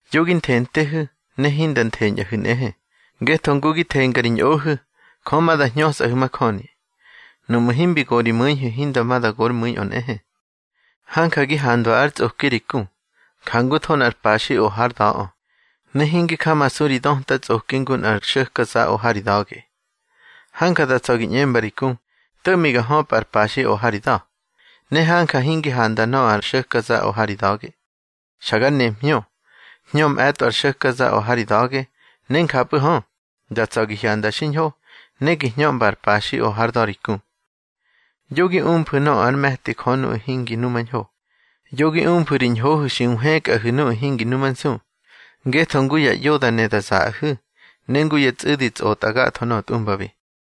Yo gi nthentehu̱, ne hinda ntheñꞌahu̱ nꞌehe. Ngetho ngu gi thenga ri ñꞌohu̱, Jö ma da hñösꞌahu̱ majöni. Nuꞌmu̱ himbi go ri mu̱ihu̱, hinda ma da gor mu̱iꞌö nꞌehe. Hanja gi handwa ár tsꞌoki ri ku, jangutho nꞌar paxi o hár da̱ꞌö, ne hingi jamasu ri döta tsꞌoki ngu nꞌar xo̱kaza o ha ri da̱ge. Hanja da tsa̱ gi ꞌñemba ri ku: To̱ꞌmi ga höpꞌa ar paxi o ha ri da̱, ne hanja hingi handa nöꞌö ar xo̱kaza o ha ri da̱ge. Xa gar nemhñö. Hñö mꞌe̱tꞌo ar xo̱kaza o ha ri da̱ge, ne njapꞌu̱ hö, da tsa̱ gi hyanda xiñho, ne gi hñömba ar paxi o hár da̱ ri ku. Yo gi umfu̱ nöꞌö ár me̱ti Jö nuꞌu̱ hingi numañho. Yo gi umfu̱ ri ñhohu̱ xi nhwëkꞌahu̱ nuꞌu̱ hingi numansu, ngetho ngu ya ꞌyo da ne da zaꞌahu̱, ne ngu ya tsꞌu̱di tsꞌotꞌa gatho nöꞌö tꞌumbabi.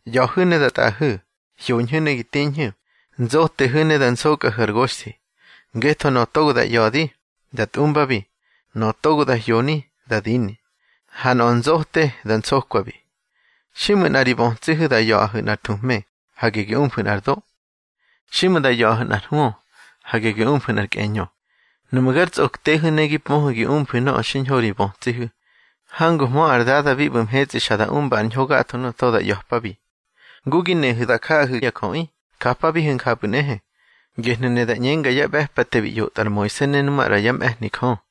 ꞌYa̱hu̱ ne da tꞌaꞌahu̱, hyoñhu̱ ne gi tiñhu̱, nzotehu̱ ne da nsokꞌahu̱ ar goxthi. Ngetho nöꞌö togo da ꞌya̱di, da tꞌumbabi, nöꞌö togo da hyoni da dini, ha nöꞌö nzote, da nsokwabi. Xiꞌmu̱ nꞌa ri bötsihu̱ da ꞌya̱ꞌahu̱ nꞌar thuhme, hage gi umfu̱ nꞌar do. Xiꞌmu̱ da ꞌya̱ꞌahu̱ nꞌar hwö, hage gi umfu̱ nꞌar kꞌeñö. Nuꞌmu̱ gar tsꞌoktehu̱ ne gi pöhu̱ gi umfu̱ nöꞌö xiñho ri bötsihu̱, hanguhmö ar Dada bi ꞌbu̱ mhetsꞌi xa da umba ar ñho gatho nuꞌu̱ togo da ꞌya̱pabi. Ngu gi nehu̱ da jaꞌahu̱ ya jöꞌi, japabihu̱ njapꞌu̱ nꞌehe. Gehnu̱ ne da ꞌñenga yá ꞌbe̱pate bi ꞌyotꞌa ar Moise ne nu maꞌra yá mꞌe̱hni Jö.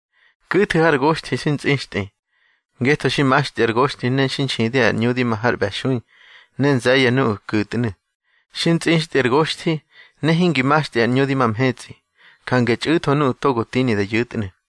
Ku̱thu̱ har goxthi xi ntsꞌixtꞌi. Ngetho xi maxtꞌi ar goxthi ne xi nxidi ar ꞌñu di ma har ꞌbe̱xui, ne nze̱ye̱ nuꞌu̱ ku̱tnu̱. Xi ntsꞌixtꞌi ar gosthi, ne hingi maxtꞌi ar ꞌñu di ma mhetsꞌi, jange txꞌu̱tho nuꞌu̱ togo tini da yu̱tnu̱.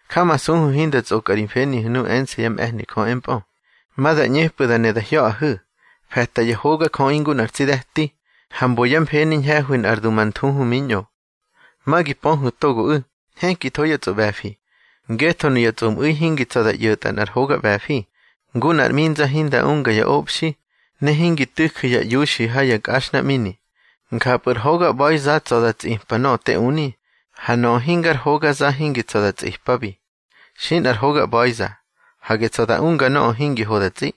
Jamasuhu̱ hinda tsꞌokꞌa ri mfenihu̱ nuꞌu̱ ense̱ yá mꞌe̱hni Jö empꞌö. Ma da ꞌñepꞌu̱ da ne da hya̱ꞌahu̱, fe̱ta ya hogajöꞌi ngu nꞌar tsi de̱ti, ha mbo yá mfeni ñhe̱hwi nꞌar dumanthuhu miñꞌo. Ma gi pöhu̱ togoꞌu̱, nhekitho yá tsꞌoꞌbe̱fi. Ngetho nuya tsꞌomꞌu̱i hingi tsa̱ da ꞌyo̱tꞌa nꞌar hoga ꞌbe̱fi. Ngu nꞌar ꞌminza hinda unga ya obxi, ne hingi tu̱ju̱ ya iuxi ha ya nkꞌaxhnaꞌmini. Njapꞌu̱ ar hoga ꞌba̱iza tsa̱ da tsꞌipa nöꞌö te uni, ha nöꞌö hingar hogaza hingi tsa̱ da tsꞌipabi. Xi nꞌar hoga ꞌba̱iza, hage tsa̱ da unga nöꞌö hingi ho da tsꞌi.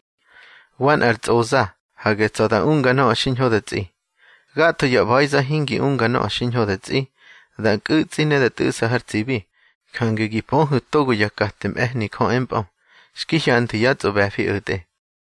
Wa nꞌar tsꞌoza, hage tsa̱ da unga nöꞌö xiñho da tsꞌi. Gatho ya ꞌba̱iza hingi unga nöꞌö xiñho da tsꞌi, da nkꞌu̱tsꞌi ne da tꞌu̱ꞌsa har tsibi. Jange gi pöhu̱ togo yá kate mꞌe̱hni Jö empꞌö, xki hyanthwu̱ yá tsꞌoꞌbe̱fi o̱tꞌe.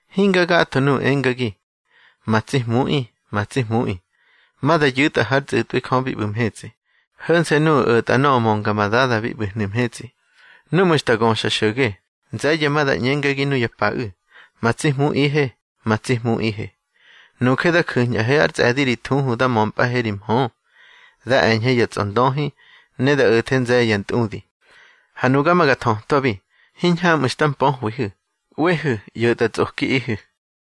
Hinga gatho nuꞌu̱ engagi: Ma tsi Hmuꞌi, ma tsi Hmuꞌi, ma da yu̱tꞌa hár tsꞌu̱tꞌwi Jö bi ꞌbu̱ mhetsꞌi; ho̱nse̱ nuꞌu̱ o̱tꞌa nöꞌö mönga ma Dada bi ꞌbu̱hnu̱ mhetsꞌi. Núꞌmu̱ xta göxa xo̱ge, nze̱ye̱ ma da ꞌñengagi nuya paꞌu̱: Ma tsi Hmuꞌihe, ma tsi Hmuꞌihe, nuje da ju̱ñꞌahe ár tsꞌe̱di ri thuhu da mömpꞌahe ri mhö, da e̱ñhe ya tsꞌondöhi, ne da o̱the nze̱ye̱ ya ntꞌudi. Ha nuga ma ga thötwabi: Hiñhamꞌu̱ xta mpöhwihu̱. ꞌWehu̱, ꞌyo̱tꞌatsꞌokiꞌihu̱.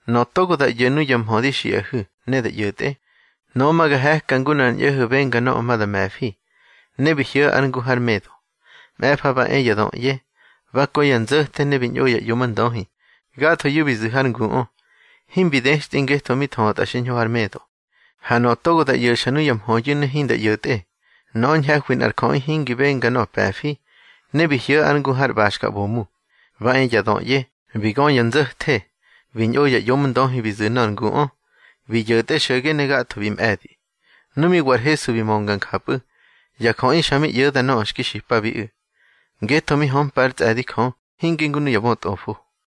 Nöꞌö togo da ꞌyo̱ nuya mhö di xiꞌahu̱ ne da ꞌyo̱tꞌe, nöꞌö ma ga he̱ka ngu nꞌar ñꞌo̱ho̱ benga nöꞌö ma da me̱fi, ne bi hyo̱ ár ngu har medo. Mꞌe̱fa ba e ya döꞌye, ba kö ya nzo̱the ne bi ñꞌo ya ꞌyomndöhi. Gathoyu̱ bi zu̱ har nguꞌö, himbi dextꞌi ngetho mi thötꞌa xiñho har medo. Ha nöꞌö togo da ꞌyo̱xa nuya mhöyu̱ ne hinda ꞌyo̱tꞌe, nöꞌö ñhe̱hwi nꞌar jöꞌi hingi benga nöꞌö pe̱fi, ne bi hyo̱ ár ngu har ꞌbaxka ꞌbomu. Ba e ya döꞌye, bi gö ya nzo̱the, bi ñꞌo ya ꞌyomndöhi bi zu̱ nöꞌö ar nguꞌö, bi yo̱tꞌe xo̱ge ne gatho bi mꞌe̱di. Nu mi wa ar Hesu bi mönga njapꞌu̱, ya jöꞌi xa mi ꞌyo̱da nöꞌö xki xipabiꞌu̱. Ngetho mi hömpa ár tsꞌe̱di Jö, hinge ngu nuya bötꞌofo.